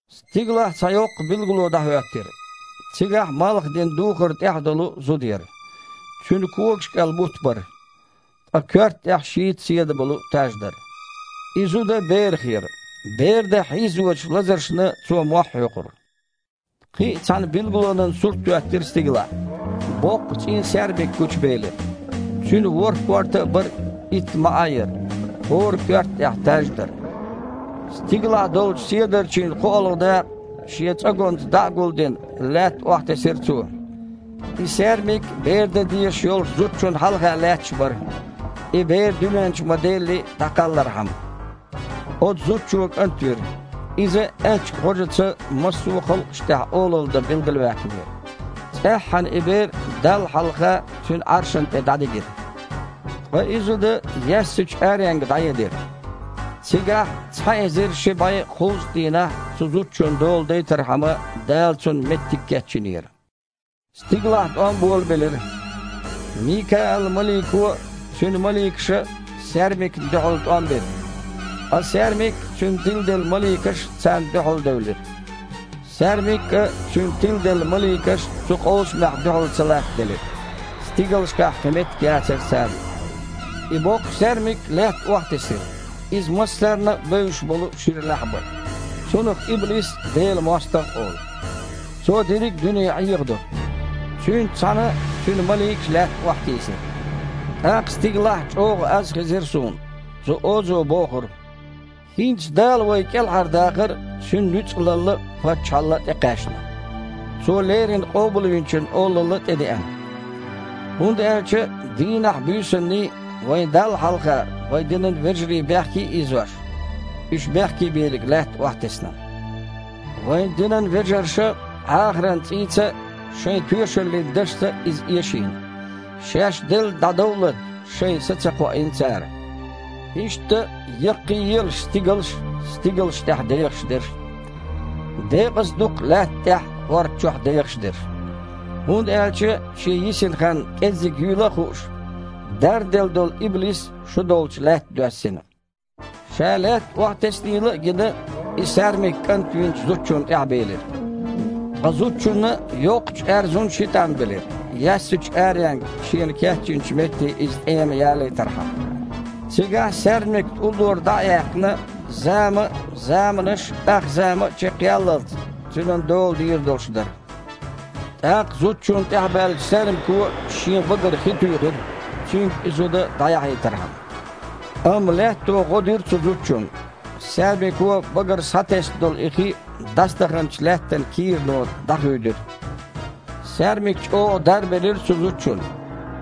Стигалахь цхьа йоккха билгало дІахІоьттира. Цигахь малхах дина духар тІехь долу зуда яра. Цуьнан когаш кІел бутт бара. Ткъа коьрта тІехь шийтта седа болу таж дара. И зуда берах яра. Бер дан хьийзочу лазаршна, цо мохь хьоькхура. Кхин а цхьана билгалонан сурт а хІоьттира стигалахь. Боккха цІен саьрмик гучубелира. Цуьнан ворхІ корта а бара, итт маІа а яра, хІора коьрта тІехь таж а дара. Стигалахь долчу седарчийн кхоалгІа дакъа, шен цІоганца дІа а гулдина, лаьтта охьатесира цо. И саьрмик бер дан дезаш йолчу зудчунна хьалха лаьтташ бара, и бер, дуьнен чу ма-делли, дІакхаллархьама. Оцу зудчо кІант вира. Иза аьчка гІожаца массо а халкъашна тІехь олалла дан билгалваьккхинера. ЦІеххьана и бер Далла хьалха, Цуьнан Іаршана тІе дІадигира. Ткъа и зуда яьссачу аренга дІаедира. Цигахь, цхьа эзар ши бІе кхузткъа дийнахь цу зудчун дола дайтархьама, Дала цунна меттиг кечйинера. Стигалахь тІом болабелира. Микаал-малико а, цуьнан маликаша а саьрмикна дуьхьал тІом бира. Ткъа саьрмик а, цуьнан тиладелла маликаш а царна дуьхьалдевлира. Саьрмик а, цуьнан тиладелла маликаш а цу къовсамехь дуьхьал ца латтаделира. Стигалшкахь кхин меттиг яцара царна. И боккха саьрмик Лаьтта охьатесира. Иза массарна а бевзаш болу шира лаьхьа бара. Цунах иблис а, Делан мостагІа а олу. Цо дерриг а дуьне Іехадо. Цуьнца цхьаьна цуьнан маликаш а лаьтта охьатийсира. ТІаккха стигалахь чІогІа аз хезира суна. Цу озо бохура: «ХІинца Дала вай кІелхьардахар а, Цуьнан нуьцкъалалла а, паччахьалла а тІекхаьчна. Цо леррина Къобалвинчун олалла а тІедеана! ХІунда аьлча, дийнаххьий, буьйсанний вайн Далла хьалха вайн динан вежарий бехке а ийзош, уьш бехкебийриг Лаьтта охьатесна. Вайн динан вежарша Іахаран цІийца а, шайн тоьшаллин дашца а иза эшийна. Шаьш делла дІадовллалц шайн са а ца кхоийна цара. Иштта, яккхийелаш стигалш а, стигалш тІехь дехаш дерш а! Декъаза ду-кх лаьтта тІехь а, хІорда чохь а дехаш дерш! ХІунда аьлча, шен йисина хан кІеззиг юйла а хууш, дарделла долу иблис шу долчу лаьтта доьссина!» Ша лаьтта охьатеснийла а гина, и саьрмик кІант винчу зудчунна тІаьхьабелира. Ткъа зудчунна йоккхачу аьрзун ши тІам белира, яьссачу аренга шена кечйинчу метте иза тІема ялийтархьама. Цигахь, саьрмикна уллора дІа а яьккхина, зама а, заманаш а, ахзама а чекхъяллалц, цуьнан дола дийр долуш дара. ТІаккха зудчунна тІаьхьабаьллачу саьрмико шен багара хи туьйхира, цуьнга и зуда дІаяхьийтархьама. Амма Лаьтто гІо дира цу зудчунна. Саьрмико багара схьатесна долу и хи, дІасадаханчу лаьттан кийрано дІахуьйдира. Саьрмик чІогІа дарбелира цу зудчунна.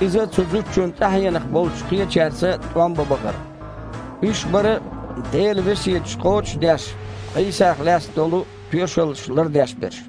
Иза цу зудчун тІаьхьенах болчу кхечаьрца тІом бан бахара. Уьш бара, Делан весеташ кхочуш а деш, Іийсах лаьцна долу тоьшалла лардеш берш.